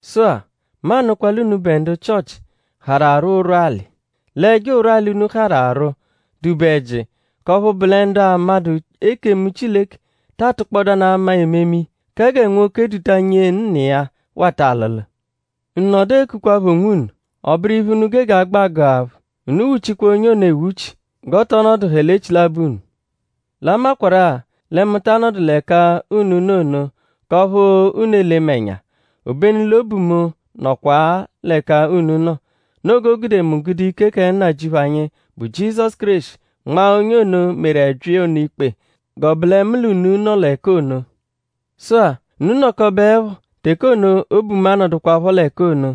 Sụ-a; mu anụkwa l'unubẹ ndu Chịochi harụ arwụ ụrwuali. L'ẹjo ụrwuali, unu harụ arwụ dụ-be ẹji; k'ọphu bụ lẹ ndu 'amadụ ekemu Chileke ta atụkpodanu ama ememe iya; kẹ gẹ nwoke duta nyee nna iya wata alụlu. Unu nọdu ekukwaphọ onwunu; ọ bụru iphe, unu gege agbẹ agụ aphụ. Unu wuchikwaa onye ono ewuchi; g'ọ tọ nọduhekwa l'echilabọ unu. L'a makwarụ-a lẹ mu ta anọdu l'ẹka unu nọ ono; k'ọphu unu ele mu ẹnya; obenu l'obu mu nọkwa-a l'ẹka unu nọ. Noo g'o gude mu gude ike kẹ Nnajịuphu anyi, bụ Jizọsu Kéreshi nmaa onye ono, meru ẹbyi ono ikpe g'ọ bụ lẹ mu l'unu nọ l'ẹka ono. Sụ-a; unu -nọkobeepho; teke ono obu mu anọdukwapho l'ẹka ono,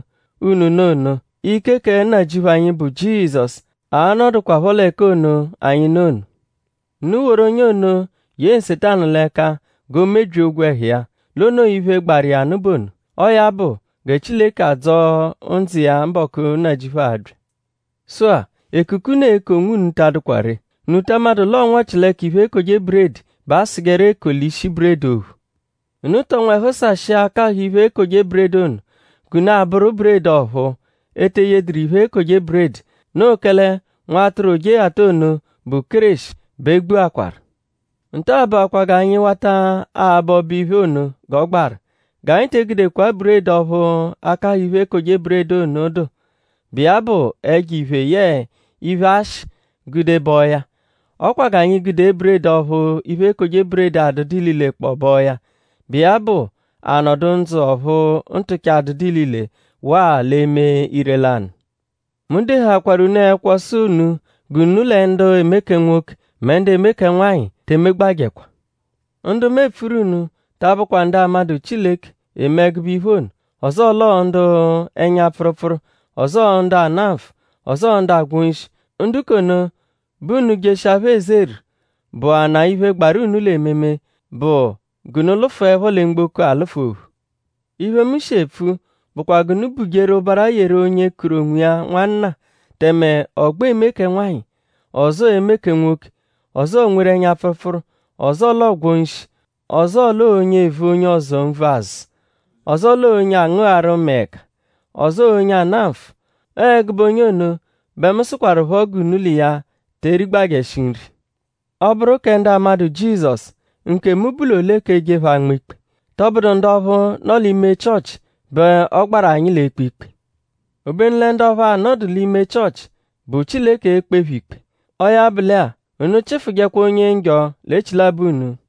unu nọ ono; ike kẹ Nnajịuphu anyi, bụ Jizọsu a-nọdukwapho l'ẹka ono, anyi nọ ono; unu woru onye ono ye Nsetanu l'ẹka g'o mebyia ogwẹhu iya; l'o noo iphe, gbaru iya nụ bụ ono. Ọo ya bụ gẹ Chileke a-dzọo ndzụ iya mbọku, Nnajịuphu a-bya. Sụ-a; ekuku, unu eku onwunu ta adụkwa ree.?Unu ta amadụ l'ọo nwọchileka iphe, ekoje buredi bẹ asụjeru ekoli ishi buredi ophu? Unu tọ nwẹhu sashịa akahụ iphe-ekoje-buredi ono, g'unu abụru buredi ọ̀phúú, e te eyedụru iphe, ekoje buredi. Noo kẹle nwatụru Ojeghata ono, bụ Kéreshi bẹ e gbuakwaru. Nta-a bụakwaa g'anyi wata abọ ọbo-iphe ono g'ọ gbaru. G'anyi te egudekwa buredi ọphu akahụ iphe-ekoje-buredi ono dụ, bụ iya bụ ẹjo-iphe yẹe iphe-ashị gude bọo ya. Ọ kwa g'anyi gude buredi ọphu iphe-ekoje-buredi adụdu ililekpọo bọo ya, bụ iya bụ anọdu ndzụ ọphu ntụcha adụdu ilile waa l'eme ire-lanụ. Mu dehaakwaru unu ẹkwo sụ unu g'unu lẹ ndu eme kẹ nwoke mẹ ndu eme kẹ nwanyị te emegbajẹkwa. Ndu mu epfuru unu ta abụkwa ndu 'amadụ Chileke, eme ẹgube iphe ono; ọzoo l'ọo ndu ẹnya-pfụrupfuru; ọzoo ndu ana nfụ; ọzoo ndu agwọ nshi. Ndu k'ono bẹ unu -jeshia phẹ ezeru; bụanaa iphe, gbaru unu l'ememe bụ g'unu lụfuepho lẹ mgboko alụfu ophu. Iphe, mu shi epfu bụkwa g'unu bujeru ụbara yeru onye kuru onwiya nwanna tẹme ọ gbẹ eme kẹ nwanyị; ọzoo eme kẹ nwoke; ọzoo nweru ẹnya-pfụrupfuru; ọzoo l'ọo gwọ nshi; ọzoo l'ọo onye evu onye ọzo nvu azụ; ọzoo l'ọo onye angụgharu mẹe ẹka; ọzoo onye ana nfụ. Ọo ẹgube onye ono bẹ mu sụkwarupho g'unu l'iya te erigbajẹshi nri. Ọ -bụru kẹ ndu amadụ Jizọsu;?nkemu bụ l'ole; k'eje phẹ anma ikpe??Tọbudu ndu ọphu nọ l'ime Chịochi bẹ ọ gbaru anyi l'ekpe ikpe? Obenu lẹ ndu ọphu anọdu l'ime Chịochi bụ Chileke e-kpe phẹ ikpe. Ọo ya bụ lẹ-a; “Unu chịfujekwa onye njọ l'echilabọ unu.”